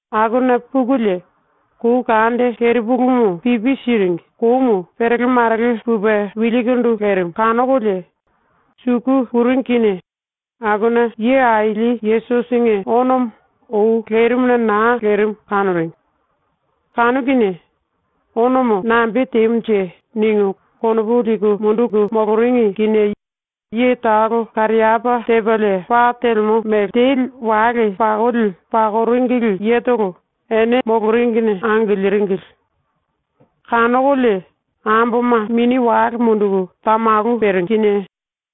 Akuna pukulie kou kande kerepulumu pipi siringi koumu perele marele pupe wilkindu lerimu kanokolie, suku puringi kinie akuna Ye Aili Yesusinge onomo ou lerimuna naa lerimu kanoringi. Kanu kinie ‘Onomo nambe temunje?’ ningu konopu liku munduku moloringi kinie ye talo kariapá tepalie pa telemo mele teli wale pakoli pakoringili yetolo ene moloringine angiliringili. Kanokolie amboma mini wale munduku tamalu peringi kinie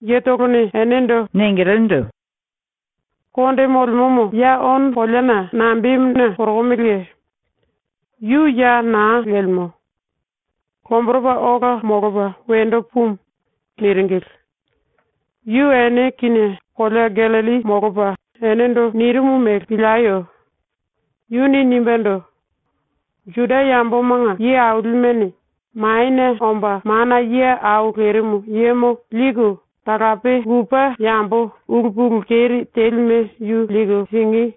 yetolone enendo ningilindu: “Konde molemomo, ya ono koleana nambemuna korokomeleye? Yu ya naa lemo. Lomboropa ola molopa wendo pumu.” ⸤niringili.⸥ “Yu ⸤ene kinie⸥ kolea Gallilli molopa enendo nirimu mele pilieyo. Yuni nimbendo: “⸤Juda yambomanga ye ailimene⸥ Manie Omba Mana Ye Au Lerimu Yemo liku talape lupe yambo ulu pulu keri telime yu liku singí,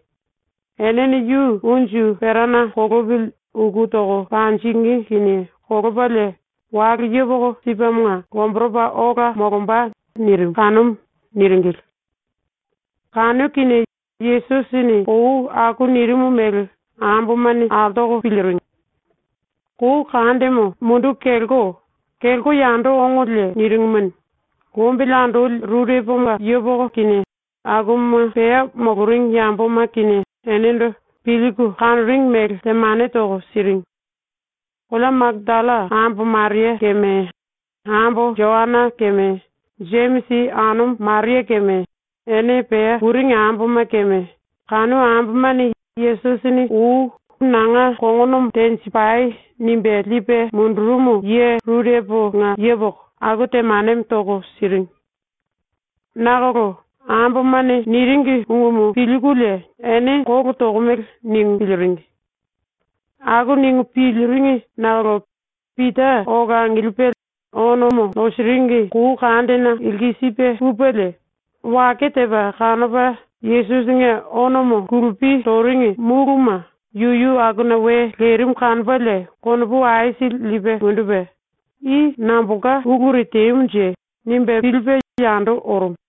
enene yu unju perana kolopili uku toko panjingí kinie kolopalie wale yepoko sipemonga lomboropa ola molomba.” nirimu kanumu.” niringili. Kanu kinie Yesusini ou aku nirimu mele ambomane altoko piliringi. Kou kandemo munduku kelko, kelko yando ongolie niringimuni, lombili andoli rureponga yepoko kinie akuma pea moloringi yamboma kinie enendo pilku kanoringi mele temane toko siringi. Kolea Makatalla ambo Maria keme, ambo Joana keme, Jemisi anumu Maria keme, ene pea puringi amboma keme, kanu ambomane Yesusini ou “Nanga kongonomo tenjipai.” nimbe lipe mundurumu ye rureponga yepoko aku temanemo toko siringi. Nakolo ambomane niringi ungumu pilkulie ‘Ene kolo tokomele.’ ningu piliringi. Aku ningu piliringi nakolo Pita ola angilipe ono nosiringi kou kandena lkisipe pupelie, wake tepa kanopa Yesusinge onomo kulupi toringi múluma yuyu akuna we lerimu kanopalie konopu aisili lipe mundupe ‘I nambolka uluri temunje?’ nimbe pilipe yando orumu.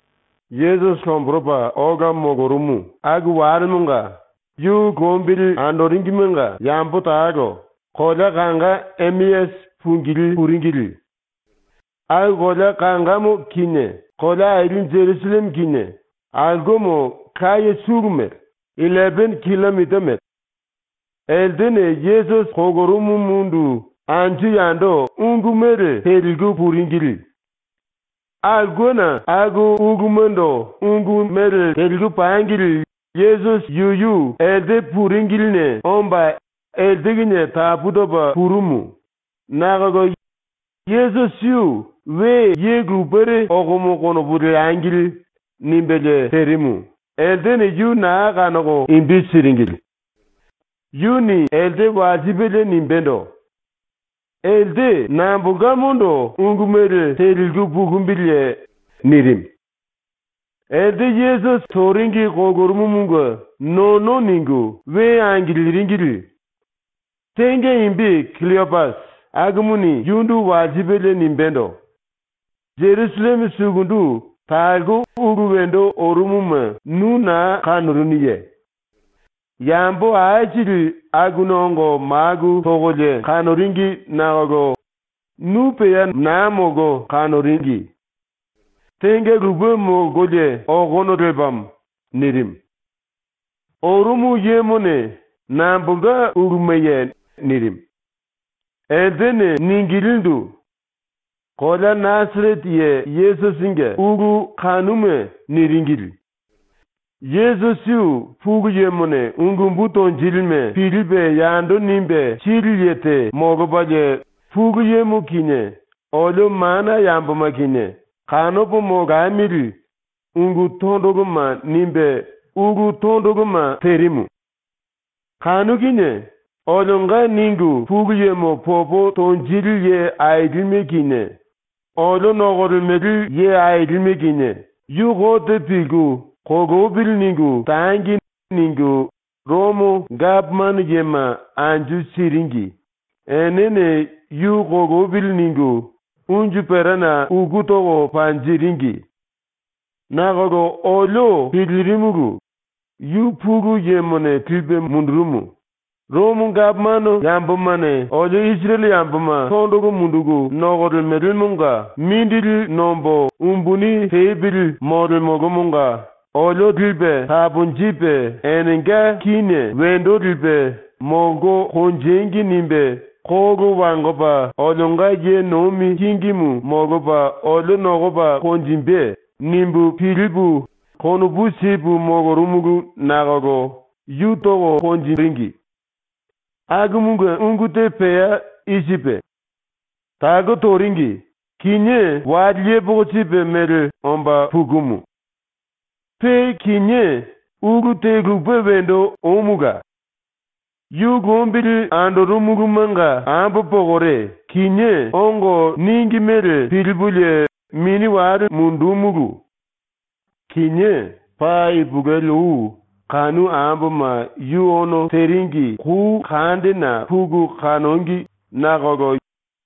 Yesusi lomboropa ola molorumu aku walemonga ⸤yu lombili andoringimenga⸥ yambo talo kolea kanga Emeasi pungilí puringili. Aku kolea kangamo kinie kolea aili Jerusalleme kinie aulkemo laye sulu mele, illepene killomita mele. Eltene Yesusi kolorumumundu anju yando ungu mele teliku puringili. Aulkena aku ulumando ungu mele teliku pangili Yesusi yuyu elte puringiline omba elte kinie tapu topa purumu, nakolo Yesusi yu ‘We ye lupere okomo konopu leangili.’ nimbelie terimu, eltene yu naa kanoko imbi siringili. Yuni elte walsipelie nimbendo: “Elte nambolkamondo ungu mele teliku pukumbiliye?” nirimu. Elte Yesusi toringi kolorumumunge nono ningu we angiliringili. Tenga imbi Killopasi, akumuni yundu walsipelie nimbendo: “Jerusalleme sukundu talko ulu wendo orumuma nu naa kanorunuye? Yambo aisili akuna ongo maku tokolie kanoringi nakolo nu pea naa molko kanoringi. Tenga lupe molkolie okono lepamo.” nirimu. Orumu yemone “Nambolka ulumaye?” nirimu. Eltene ningilindu: “Kolea Nasarete ye Yesusinge ulu kanuma.” niringili. “Yesusi yu Pulu Yemone ungu umbu tonjilime pilipe yando nimbe sili ye te molopalie Pulu Yemo kinie olio mana yamboma kinie kanopo molamili ungu tondoloma nimbe ulu tondoloma terimu. Kanu kinie olionga ningu Pulu Yemo popo tonjili ye ailime kinie olio nokolemele ye ailime kinie ‘Yu kote pilku “Kolopili.” ningu tangi.’ ningu ⸤Romo gapomano yema⸥ anju siringi enene ‘Yu kolopili.’ ningu unju perana uku toko panjiringi. Nakolo olio pilirimulu, ‘Yu Pulu Yemone lipe mundurumu, ⸤Romo gapomano yambomane olio⸥ Isirele yamboma ⸤tondolo munduku nokolemelemonga⸥ mindili nombo umbuni tepili molemolomonga olio lipe taponjipe ⸤enenga kíne⸥ wendo lipe ‘Molko konjengi.’ nimbe ⸤kolo wangopa⸥ olionga ye nomi kingimu molopa olio nokopa konjimbe.’ nimbu pilipu konopu sipu molorumulu nakolo yu toringi. Akumunge ungu te pea i sipe: Talko toringi, kinié wale yepoko sipe mele omba pukumu. “Pe kinié ulu te lupe wendo omula. Yu lombili andorumulumanga ambo pokore kinié ongo níngi mele pilipulie mini wale mundúmulu. Kinié paa ipulueli ou kanu amboma yu ono teringi kou kandena puku kanongi nakolo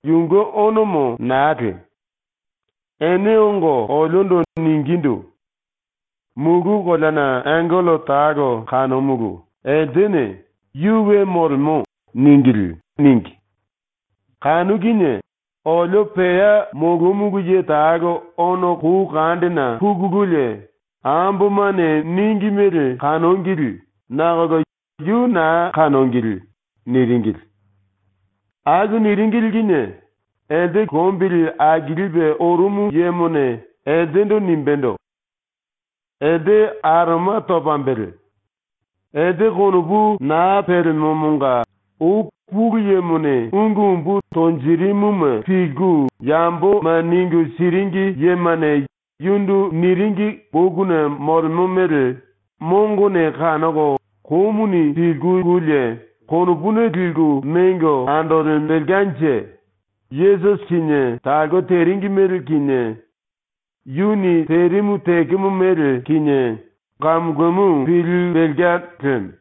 yunge onomo naa lemu. Ene ongo oliondo ningindu: “Mulu koleana angello talo kanomulu, eltene “Yu we molemo.” níngili.” níngi. Kanu kinie olio pea molomulu ye talo ono kou kandena pukululie ambomane níngi mele kanongili, nakolo yu naa kanongili.” niringili. Aku niringili kinie elte lombili akilipe orumu yemone eltendo nimbendo: “Elte aroma topambele. Elte konopu naa pelemomonga ou Pulu Yemone ungu umbu tonjiringime pilku yamboma ningu siringi yemane yundu niringi bokuna molemo mele mongone kanoko komuni pilkululie konopuna liku mengo andolembelkanje ⸤Yesusi kinie talko teringi mele kinie yuni terimu tekemo mele kinie⸥ kamu kamu pilimbelka lemo.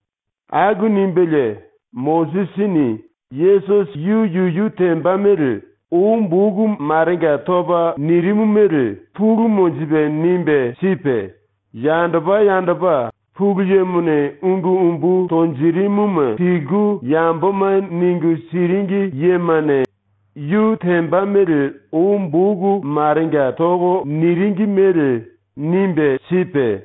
Aku nimbelie Mosisini Yesusi yu yuyu temba mele ou boku marenga topa nirimu mele pulu monjipe nimbe sipe, yandopa yandopa Pulu Yemone ungu umbu tonjirimuma pilku yamboma ningu siringi yemane yu temba mele ou boku marenga toko niringi mele nimbe sipe,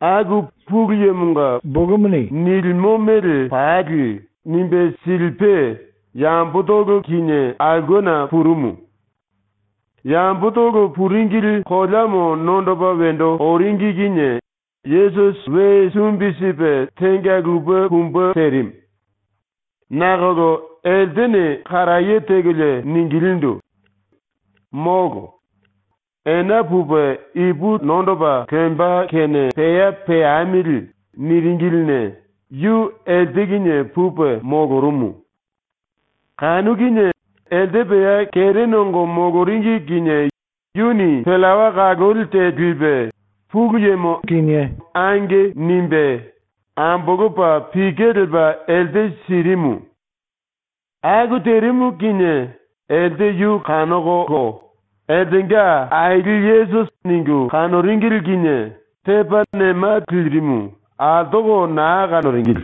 aku Pulu Yemonga bokumuni nilimo mele pali nimbe silipe yambotolo kinie aulkena purumu. Yambotolo puringili koleamo nondoko wendo oringi kinie Yesusi we sumbi sipe tenga lupe pumbe terimu. Nakolo eltene karaye tekolie ningilindu: “Molo. Ena pupe ipu nondopa lemba kene pea peamili.” niringiline yu elte kinie pupe molorumu. Kanu kinie elte pea kere nongo moloringi kinie yuni pillawa kaloli te lipe Pulu Yemo “Ange.” nimbe, ambolopa pike lepa elte sirimu. Aku terimu kinie elte yu kanokolo eltenga Aili Yesusi ningu kanoringili kinie tepa nema lirimu altoko naa kanoringili.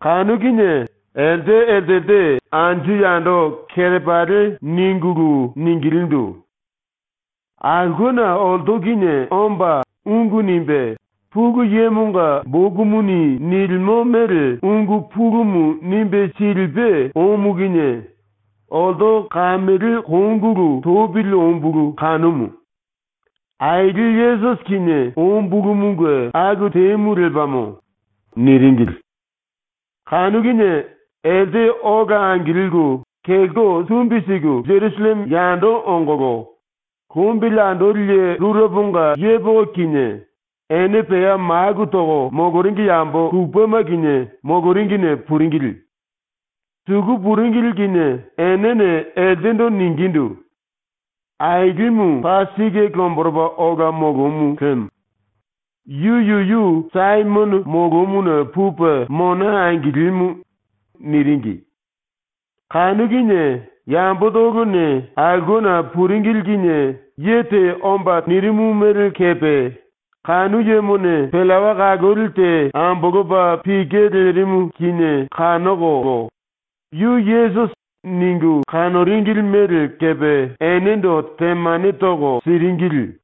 Kanu kinie elte eltelte anju yando kerepali ningulu ningilindu: “Aulkena olto kinie omba ungu nimbe Pulu Yemonga bokumuni nilimo mele ungu pulumu nimbe silipe omu kinie olto kamele kongulu topili ombulu kanumu. Aili Yesusi kinie ombulumunge aku temu lepamo.” niringili. Kanu kinie elte ola angilku kelko sumbi siku Jerusalleme yando ongolo, lombili andoli ye rureponga yepoko kinie ene pea maku toko moloringi yambo lupema kinie moloringine puringili. Suku puringili kinie enene eltendo ningindu: “Ailimu paa sike lomboropa ola molomu lemo. Yu yuyu Saimono molomuna pupe mona angilimu.” niringi. Kanu kinie yambotolone aulkena puringili kinie ye te omba nirimu mele kepe kanu yemone pillawa kaloli te ambolopa pike lerimu kinie kanokolo ‘Yu Yesusi.’ ningu kanoringili mele kepe enendo temane toko siringili.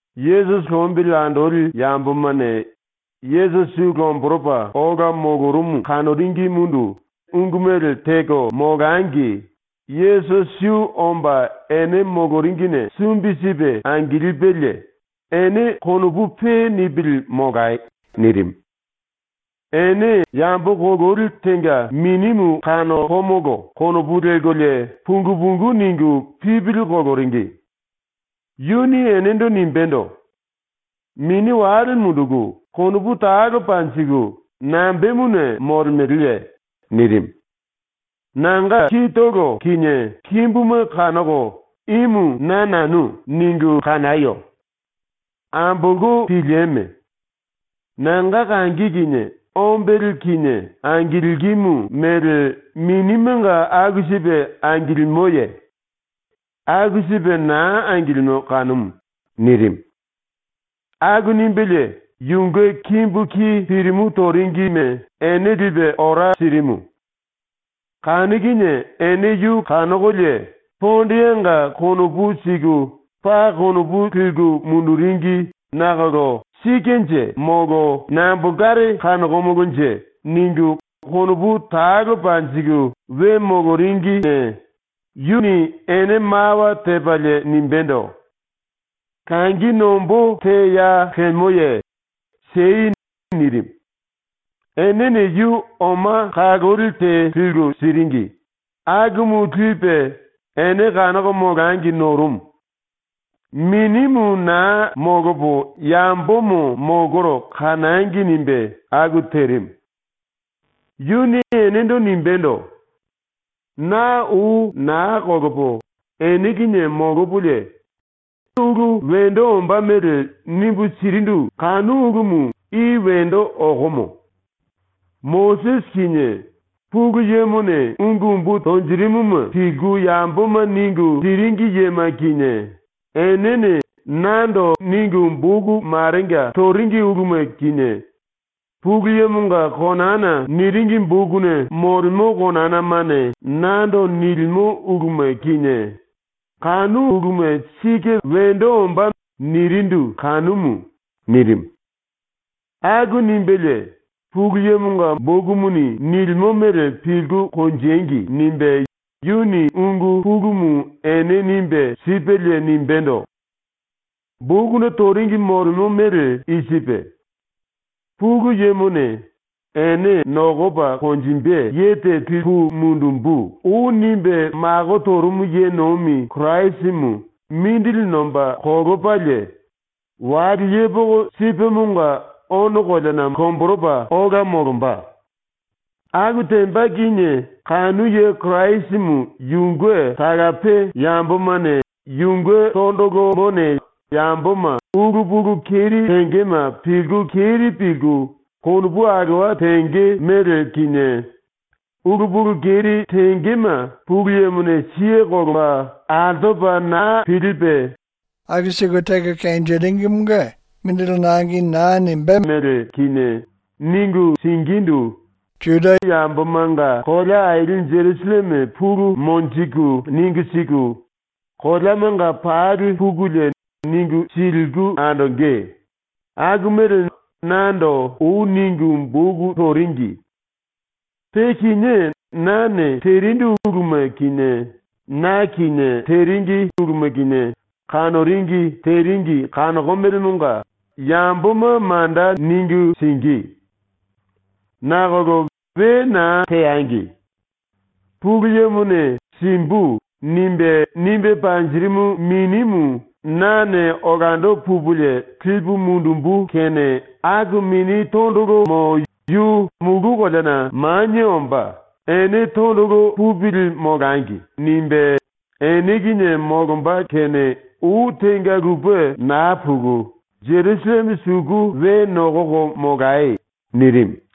⸤Yesusi lombili andoli⸥ yambomane ⸤Yesusi yu lomboropa ola molorumu kanoringimundu⸥ ungu mele teko molangi Yesusi yu omba ene moloringine sumbi sipe angilipelie “Ene konopu pe nipili molai.” nirimu. Ene ‘Yambo kololi tenga minimu kanokomolo.’ konopu lelkolie pungu pungu ningu pipili koloringi. Yuni enendo nimbendo: “Mini wale munduku konopu talo panjiku nambemuna molemeleye?” ⸤nirimu.⸥ “Nanga kitolo kinie kimbuma kanoko ‘Imu na nanu.’ ningu kanayo. Ambolko pilieme. Nanga kangi kinie ombele kinie angilkimu mele minimenga aku sipe angilimoye? ⸤Aku sipe naa angilimo kanumu.⸥” nirimu. Aku nimbelie yunge kimbu ki pirimu toringime ene lipe ora sirimu. Kanu kinie ene yu kanokolie pondeanga konopu siku paa konopu liku munduringi nakolo ‘Sikenje molo nambolkare kanokomolonje?’ ningu konopu talo panjiku we moloringine yuni ene mawa tepalie nimbendo: “Langi nombó te ya lemoye? Siei.” nirimu. Enene yu oma kaloli te liku siringi, akumu lipe ene kanoko molangi norumu. ⸤‘Minimu naa molopo yambomo molkoro kanangi.’ nimbe aku terimu.⸥ Yuni enendo nimbendo: “Na ou naa kolopo ene kinie molopolie ene ulu wendo ombá mele nimbu sirindu kanu ulumu i wendo okomo. “Mosisi kinie Pulu Yemone ungu umbu tonjirimuma pilku yamboma ningu siringi yema kinie enene nando ningu boku marenga toringi uluma kinie, Pulu Yemonga konana niringi bokuna molemo konanamane nando nilimo uluma kinie, kanu uluma sike wendo ombá.” nirindu kanumu.” nirimu. Aku nimbelie ‘Pulu Yemonga bokumuni nilimo mele pilku konjengi.’ nimbe yuni ungu pulumu ene nimbe sipelie nimbendo: “Bokuna toringi molemo mele i sipe: ‘Pulu Yemone “Ene nokopa konjimbe ye te lipu mundumbu.” ou nimbe mako torumu ye nomi Kirasimu mindili nomba kolopalie wale yepoko sipemonga ono koleana lomboropa ola molomba. Aku temba kinie kanu ye Kirasimu yunge talape yambomane yunge tondolomone yamboma ulu pulu keri tengema pilku keri pilku konopu alowa tenge mele kinie, ulu pulu keri tengema Pulu Yemone siye kolopa altopa naa pilipe mongo naa simbe mele kinie, ningu singíndu Isirele yambomanga kolea aili Jerusalleme pulu monjiku ningu siku koleamanga pali pukulie ningu siliku andonge.’, aku mele nando ou ningu boku toringi. “Pe kinié nane terindu uluma kinie na kinie teringi uluma kinie kanoringi teringi kanokomelemonga yamboma manda ningu singí. Nakolo we naa teangi. Pulu Yemone “Simbu.” nimbe nimbe panjirimu Minimu nane olando pupulie lipu mundumbu kene aku Mini Tondolomo yu mulu koleana manie omba ‘Ene tondolo pupili molangi.’ nimbe ene kinie molomba kene ou tenga lupe naa puku Jerusalleme suku we nokoko molai.” nirimu.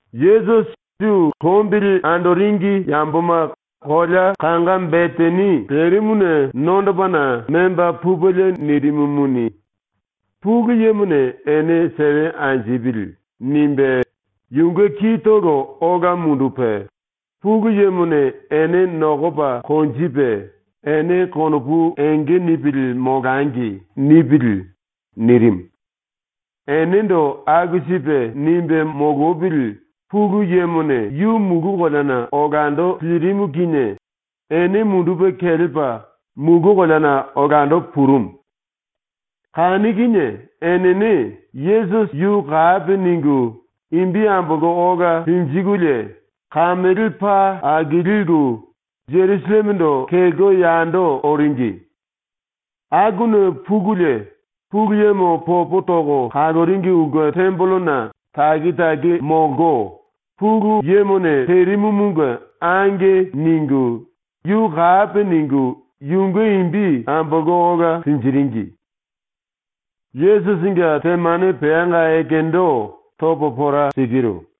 Yesusi yu lombili andoringi yamboma kolea kanga Betani lerimuna nondopana memba pupelie nirimumuni, ‘Pulu Yemone ene sewe anjipili.’ nimbe yunge kitolo ola mundupe, “Pulu Yemone ene nokopa konjipe ‘Ene konopu enge nipili molangi.’ nipili.” nirimu. Enendo aku sipe nimbe molopili ⸤Pulu Yemone⸥ yu mulu koleana olando lirimu kinie ene mundupe kelepa mulu koleana olando purumu. Kanu kinie enene ⸤Yesusi⸥ yu kapi ningu imbi ambolko ola linjikulie kamele paa akoliku, Jerusallemendo kelko yando oringi. Akuna pukulie ⸤Pulu Yemo popo toko kaloringi⸥ ulke tembelena taki taki molko, Pulu Yemone terimumunge “Ange.” ningu yu kapi ningu yunge imbi ambolko ola linjiringi. ⸤Yesusinge temane peanga ekendo topo pora sikiru.⸥